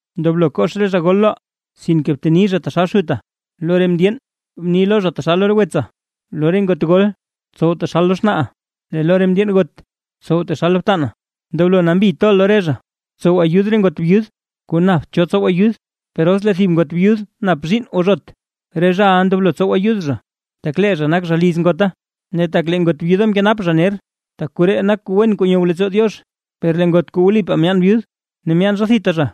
Ndoblo kox re zha gol loʼa, sinke bteni zha taxal xuta; lo re mndyeen bni lo zha taxal lo re wetsa, lo re ngot gol tsow taxal lo xnaaʼa, lee lo re mndyeen got tsow taxal lo btana, ndoblo nambi toʼa lo re zha. Btsow ayud re ngot byud, kuu napt cho tsow ayud. Per os lee thib ngot byud nap zhiinn o zhot, re zhaʼa ndoblo tsow ayud zha, tak lee zha nak zha liz ngota ne tak lee ngot byuda mkenap zha ner. Tak koree nak kuu wen kuu nyow leettsoo Diox. Per lee ngot kuu wlipaa myaan byud, ne myaan zha thita zha,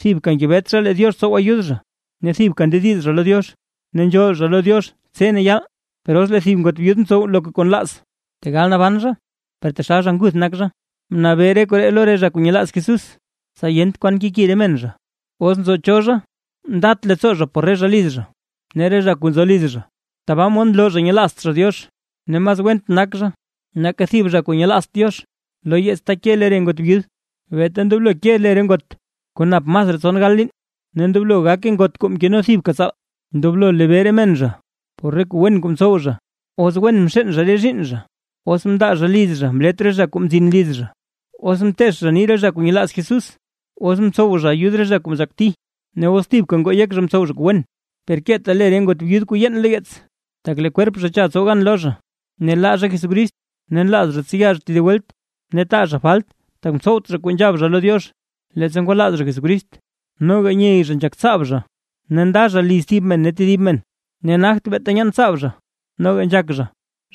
thibka ngebet zha lee Diox tsow ayud zha, ne thibka ndediz zha lo Diox ne nzhool zha lo Diox tse ne yaal. Per os lee thib ngot byud ntsow loka kuu nlaaz, tegal naban per taxal zha nguth nak zha. Bnabee re koree lo re zha kuu nyelaaz Jesús, tsa yent kwan keki re men zha. Os nzo cho zha ndat leettsoo zha por re zha liz zha, ne re zha kuu nzo liz zha, tabaa mod nloo zha nyelaazt zha Diox, ne mas went nak zha nake thib zha kuu nyelaazt Diox. Lo yeets ta ke lee re ngot byud, beeta ndoblo ke le re ngot kuu nap masraa tson gal liin, ne ndoblo gake ngot kuu mkeno thibka tsaale. Ndoblo nlebee re men zha por re kuu wen kuu mtsow zha: os wen mxeen zha re zhiinn zha, os mndaa zha liz zha mlet re zha kuu mzin liz zha, os mteech zha nii re zha kuu nyelaaz Jesús, os mtsow zha ayud re zha kuu mzhakti ne os thibka ngoo yek zha mtsow zha kuu wen. Per keeta le re ngot byud kuu yeen lo yeets, tak lee kwerp zha cha tsow gan lo zha, ne laa zha Jesucrist, ne nlaaz zha tseya zha tedib welt, ne taa zha falt tak mtsowt zha kuu nzhab zha lo Diox, leettsa ngwalaaz zha Jesucrist. Noga nyey zha nzhak tsaab zha, ne nda zha liz thib men ne tedib men; ne nagt beeta nyaan tsaab zha, noga nzhak zha,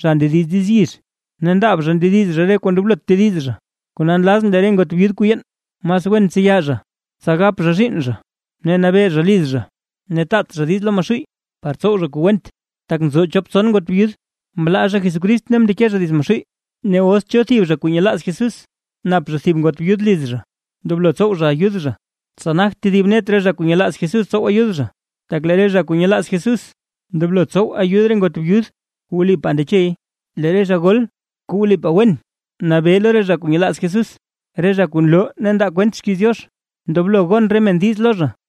zha ndediz diiz yizh, ne ndaab zha ndediz zha re kuu ndoblot tediz zha. Kona nlazʼn lee re ngot byud kuu yeen, mas wen tseya zha, tsa gap zha zhiinn zha, ne nabee zha liz zha; ne taat zha diiz lo Maxuuy par tsow zha kuu went. Tak nzo chop tson ngot byud, mlaa zha Jesucrist ne mndeke zha dits Maxuuy. Ne os cho thib zha kuu nyelaaz Jesús, nap zha thib ngot byud liz zha, ndoblo tsow zha ayud zha, tsa nagt tedib net re zha kuu nyelaaz Jesús tsow ayud zha, tak lee re zha kuu nyelaaz Jesús, ndoblo tsow ayud re ngot byud kuu wlipaa ndechey. Lee re zha gol kuu wlipaa wen nabee lo re zha kuu nyelaaz Jesús, re zha kuu nloo ne ndaa kwent xkiiz Diox, ndoblo gon re men diiz lo zha.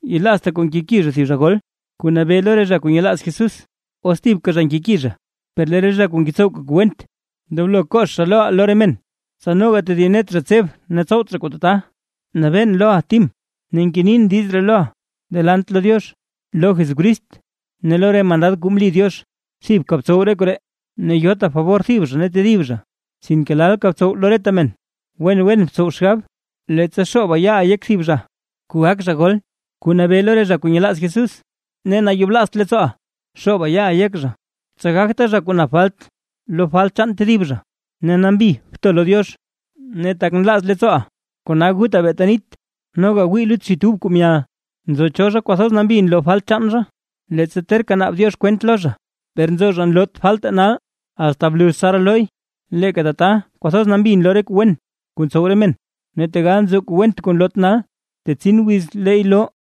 Yelaazta kuu nkeki zha thib zha gol kuu nabee lo re zha kuu nyelaaz Jesús, os thibka zha nkeki zha. Per lee re zha kuu ngetsowka kuu went, ndoblo kox zha loʼa lo re men, tsa noga tedib net zha tseb zha ne tsowt zha kuu tata. Nabeen loʼa Tim ne ngenin diiz ree loʼa delant lo Diox, lo Jesucrist ne lo re mandad kuu mli Diox, thibka btsow re koree; ne yota fabor thib zha ne tedib zha, sinke lalka btsow lo reta men. Wen wen btsow xgab, leettsa xooba yaaʼa yek thib zha kuu gak zha gol, kuu nabee lo re zha kuu nyelaaz Jesús, ne nayoblaazt leettsooʼa xooba yaaʼa yek zha, tsa gagta zha kuu nap falt lo falt chaan tedib zha, ne nambi bto lo Diox. Ne tak nlaaz leettsooʼa kona guta beeta nit, noga gwii lut xit ub kuu myal. Nzo cho zha kwathoz nambi nloo falt chaan zha, leettsa terka naab Diox kwent lo zha, per nzo zha nloot falte nal, asta bluz tsaraa loy. Leeka tata kwathoz nambi nloo re kuu wen kuu ntsow re men; ne tegal nzo kuu went kuu nloot nal, tetsin wiz leey loo.